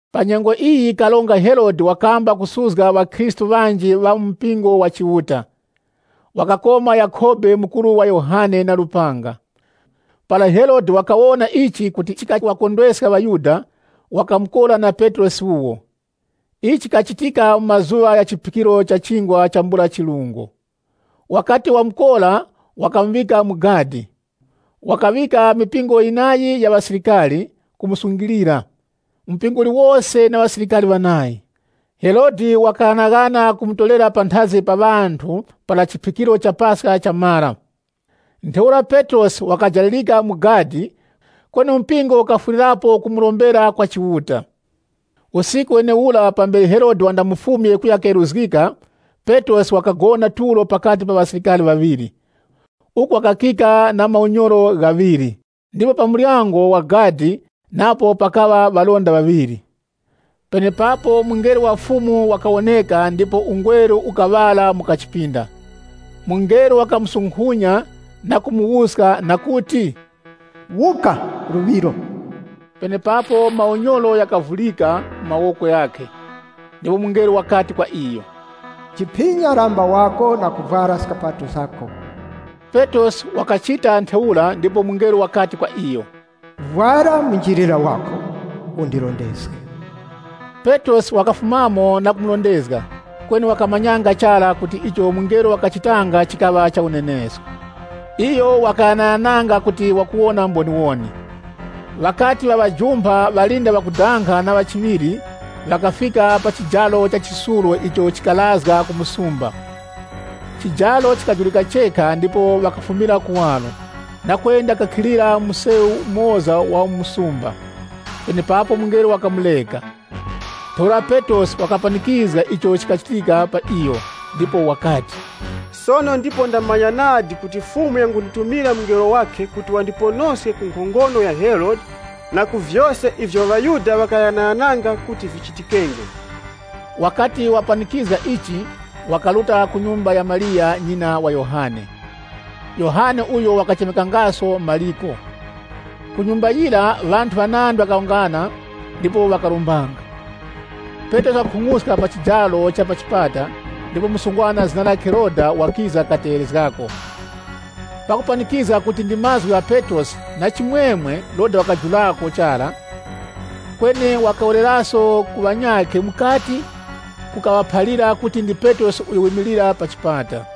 Pa nyengo iyi Karonga Herode wakamba kusuzga ŵakhristu ŵanji ŵa mu mpingo wa Chiuta. Wakakoma Yakhobe mukuru wa Yohane na lupanga. Para Herode wakawona kuti ichi chikaŵakondweska ŵaYuda, wakamukora na Petrosi wuwo. Ichi chikachitika mu mazuŵa gha chiphikiro cha Chingwa chambula chirungo. Wakati wamukora wakamuŵika mu gadi. Wakaŵika mipingo yinayi ya ŵasilikari kumusungilira, mpingo uliwose na ŵasilikari ŵanayi. Herode wakaghanaghana kumutorera panthazi pa ŵanthu para Paska chamara. Ntheura Petrosi wakajalirika mu gadi, kweni mpingo ukafwirirapo kumurombera kwa Chiuta. Usiku wenewura, pambere Herode wandamufumye kuya keruzgika, Petrosi wakagona tulo pakati pa ŵasilikari ŵaŵiri, uku wakakika na maunyoro ghaŵiri, ndipo pa muryango wa gadi napo pakaŵa ŵalinda ŵaŵiri. Penepapo mungelo wa Fumu wakawoneka ndipo ungweru ukaŵala mu kachipinda. Mungelo wakamusukunya na kumuwuska na kuti, “Wuka luŵiro!” Penepapo maunyoro ghakavurika mu mawoko ghakhe. Ndipo mungelo wakati kwa iyo, “Jiphinya lamba wako na kuvwara skapato zako.” Petrosi wakachita ntheura ndipo mungelo wakati kwa iyo, “Vwara munjilira wako, undirondezge.” Petrosi wakafumamo na kumurondezga, kweni wakamanyanga chara, kuti icho mungelo wakachitanga chikaŵa cha unenesko. Iyo wakaghanaghananga kuti wakuwona mboniwoni. Ŵakati ŵaŵajumpha ŵalinda ŵakudanga na ŵa chiŵiri, ŵakafika pa chijaro cha chisulo icho chikarazga ku msumba. Chijaro chikajurika chekha ndipo ŵakafumira kuwaro, na kwenda kukhilira mu msewu umoza wa mu msumba, penepapo mungelo wakamureka. Ntheura Petrosi wakapanikizga icho chikachitika pa iyo, ndipo wakati, “Sono ndipo ndamanya nadi kuti Fumu yangunditumira mungelo wakhe kuti wandithaske ku nkhongono ya Herode, na ku vyose ivyo ŵaYuda ŵakaghanaghananga kuti vichitikenge.” Wakati wapanikizga ichi, wakaruta ku nyumba ya Mariya, nyina wa Yohane, uyo wakachemekanga Mariko, uko ŵanthu ŵanandi ŵakawungana ndipo ŵakarombanga. Petrosi wakakhung'uska pa chijaro cha pa chipata, ndipo msungwana zina lakhe Roda wakiza kategherezgako. Pakupanikizga kuti ndi mazgu gha Petrosi, na chimwemwe Roda wakajulako chara kweni wakawereraso ku ŵanyakhe mukati kukaŵaphalira kuti ndi Petrosi uyo wimilira pa chipata.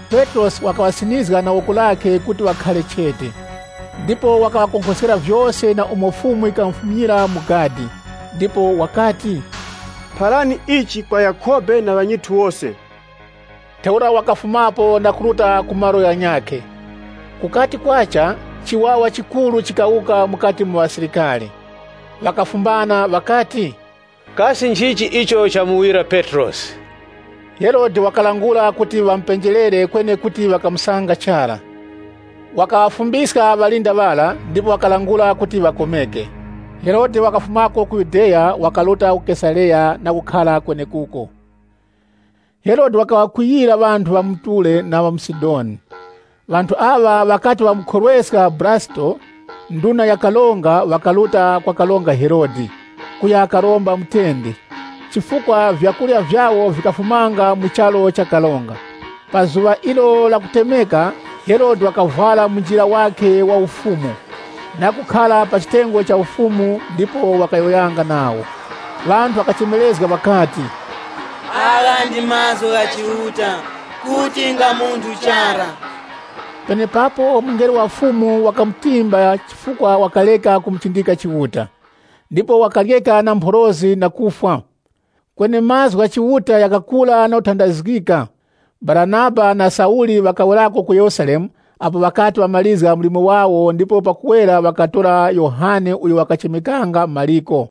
Petrosi wakaŵasinizga na woko lakhe kuti ŵakhare chete, ndipo wakaŵakonkhoskera vyose na umo Fumu yikamufumyira mu gadi. Ndipo wakati, “Pharani ichi kwa Yakhobe na ŵanyithu wose.” Ntheura wakafumapo na kuruta ku malo ghanyakhe. Kukati kwacha, chiwawa chikuru chikawuka mukati mu ŵasilikari. Ŵakafumbana ŵakati, “Kasi nchichi icho chamuwira Petrosi?” Herode wakalangula kuti ŵamupenjerere kweni kuti ŵakamusanga chara. Wakaŵafumbiska ŵalinda ŵara, ndipo wakalangula kuti ŵakomeke. Herode wakafumako ku Yudeya, wakaruta ku Kesareya na kukhara kwenekuko. Herode wakaŵakwiyira ŵanthu ŵa mu Ture na ŵa mu Sidoni. Ŵanthu aŵa, ŵakati ŵamukhorweska Bulasito, nduna ya karonga, ŵakaruta kwa Karonga Herode, kuya karomba mutende, chifukwa vyakurya vyawo vikafumanga mu charu cha karonga. Pa zuŵa ilo la kutemeka, Herode wakavwara munjilira wakhe wa ufumu, na kukhara pa chitengo cha ufumu ndipo wakayowoyanga nawo. Ŵanthu ŵakachemerezga ŵakati, “Agha ndi mazgu gha chiuta, kuti nga munthu chara!” Penepapo mungelo wa Fumu wakamutimba chifukwa wakareka kumuchindika Chiuta, ndipo wakaryeka na mphorozi na kufwa. Kweni mazgu gha Chiuta ghakakula na kutandazgika. Baranaba na Sauli ŵakawerako ku Yerusalemu apo ŵakati ŵamarizga mlimo wawo ndipo pakuwera wakatora Yohane uyo wakachemekanga Mariko.